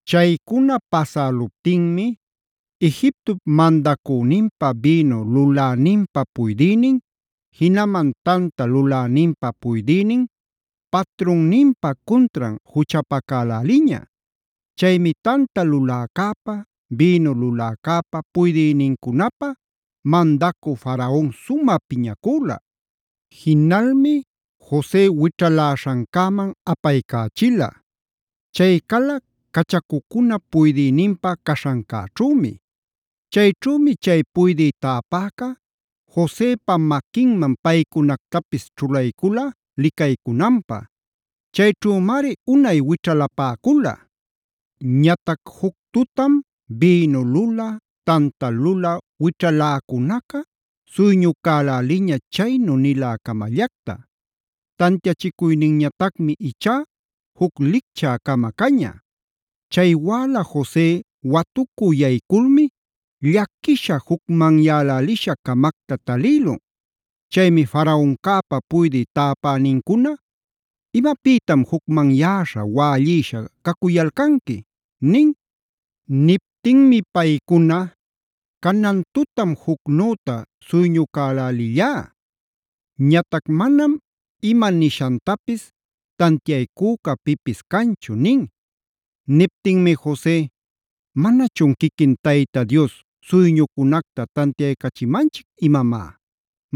Chaycuna pasäluptinmi Egiptop mandacüninpa bïnu luläninpa puydïnin, jinaman tanta luläninpa puydïnin patrunninpa cuntran juchapacäläliña. Chaymi tanta luläcäpä, bïnu luläcäpä puydïnincunapä mandacü Faraonca sumä piñacüla. Jinalmi Jose wićhaläśhancäman apaycächila. Chay cala cachacucunap puydïninpa caśhancäćhümi. Chayćhümi chay puydï täpäca Josepa maquinman paycunactapis ćhulaycula licaycunanpä. Chayćhümari unay wićhalapäcula. Ñatac juc tutam bïnu lulä, tanta lulä wićhaläcunaca suyñucäläliña chaynu nilä-camallacta; tantiachicuyninñatacmi ichá juc licchä-cama caña. Chay wäla Jose watucü yayculmi llaquisha jucmanyälälisha-camacta talïlun. Chaymi Faraoncäpa puydï täpänincuna: “¿Imapïtam jucmanyäśha wällïsha cacuyalcanqui?” nin. Niptinmi paycuna: “Canan tutam jucnüta suyñucälälillá. Ñatac manam ima nishantapis tantiaycüca pipis canchu” nin. Niptinmi Jose: “¿Manachun quiquin Tayta Dios suyñucunacta tantiaycachimanchic imamá?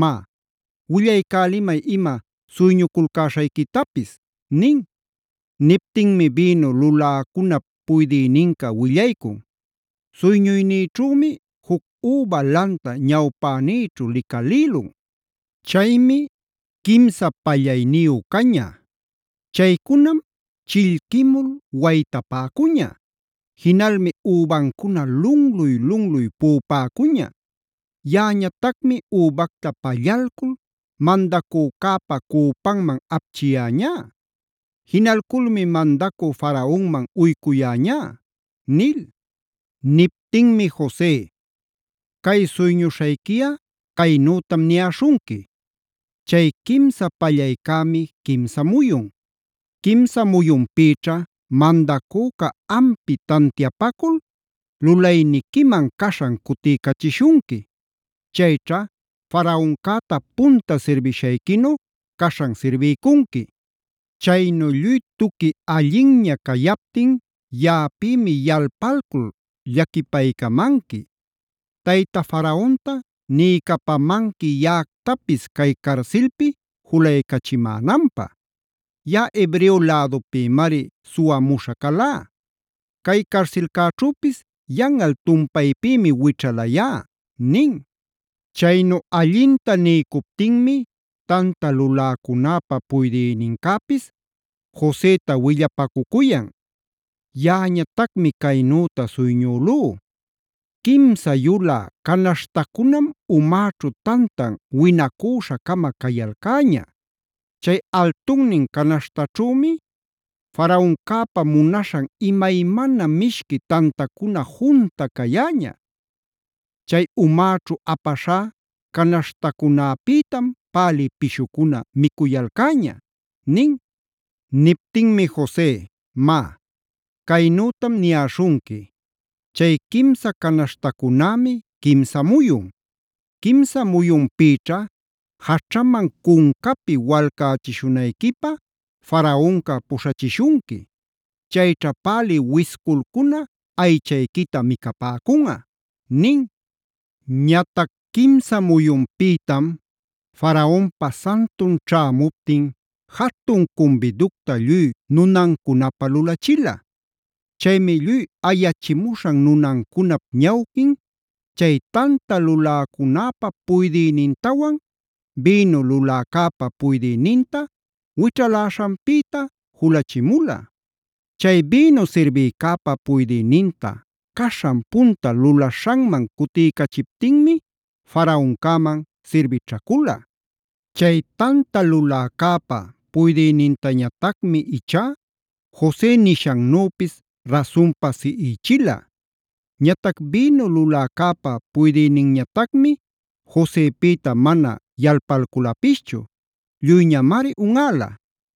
Má, willaycälimay ima suyñuculcäśhayquitapis” nin. Niptinmi bïnu luläcunap puydïninca willaycun: “Suyñuynïćhümi juc üba lanta ñawpänïćhu licalïlun. Chaymi quimsa pallayniyu caña. Chaycunam chillquimul waytapäcuña. Jinalmi übancuna lunluy-lunluy puꞌupäcuña. Yaꞌañatacmi übacta pallalcul mandacücäpa cüpanman apchiyäñá. Jinalculmi mandacü Faraonman uycuyäñá” nil. Niptinmi Jose: “Cay suyñuśhayquiꞌa caynütam niyäśhunqui: ‘Chay quimsa pallaycämi, quimsa muyun. Quimsa muyunpïćha mandacüca ampi tantiapacul lulayniquiman caśhan cutiycachishunqui. Chayćha Faraoncäta punta sirbishayquinu caśhan sirbiycunqui. Chaynu lluy tuqui allinña cayaptin yaꞌapïmi yalpalcul llaquipaycamanqui. Tayta Faraonta niycapamanqui yaꞌactapis cay carsilpi julaycachimänanpä. Yaꞌa Hebreo lädupïmari suwamuśha calá. Cay carsilcäćhüpis yanꞌal tumpaypïmi wićhalayá’” nin. Chaynu allinta niycuptinmi tanta luläcunäpä puydïnincäpis Joseta willapacucuyan: “Yaꞌañatacmi caynüta suyñülú: ‘Quimsa yulä canaśhtacunam umäćhu tantan winacuśha-cama cayalcäña. Chay altunnin canaśhtaćhümi Faraoncäpa munaśhan imaymana mishqui tantacuna junta cayäña. Chay umäćhu apaśhá canaśhtacunäpïtam pälï pishucuna micuyalcäña’” nin. Niptinmi Jose: “Má, caynütam niyäśhunqui: ‘Chay quimsa canaśhtacunämi quimsa muyun. Quimsa muyunpïćha jaćhaman cuncapi walcächishunayquipä Faraonca puśhachishunqui. Chayćha pälï wisculcuna aychayquita micapäcunꞌa’” nin. Ñatac quimsa muyunpïtam Faraonpa santun ćhämuptin jatun cumbiducta lluy nunancunapä lulachila. Chaymi lluy ayachimuśhan nunancunap ñawquin chay tanta luläcunäpä puydïnintawan, bïnu luläcäpa puydïninta wićhaläśhanpïta julachimula. Chay bïnu sirbïcäpa puydïninta caśhan punta lulaśhanman cutiycachiptinmi Faraoncäman sirbićhacula. Chay tanta luläcäpa puydïnintañatacmi ichá Jose nishannüpis rasunpa siꞌichila. Ñatac bïnu luläcäpa puydïninñatacmi Josepïta mana yalpalculapischu; lluyñamari unꞌäla.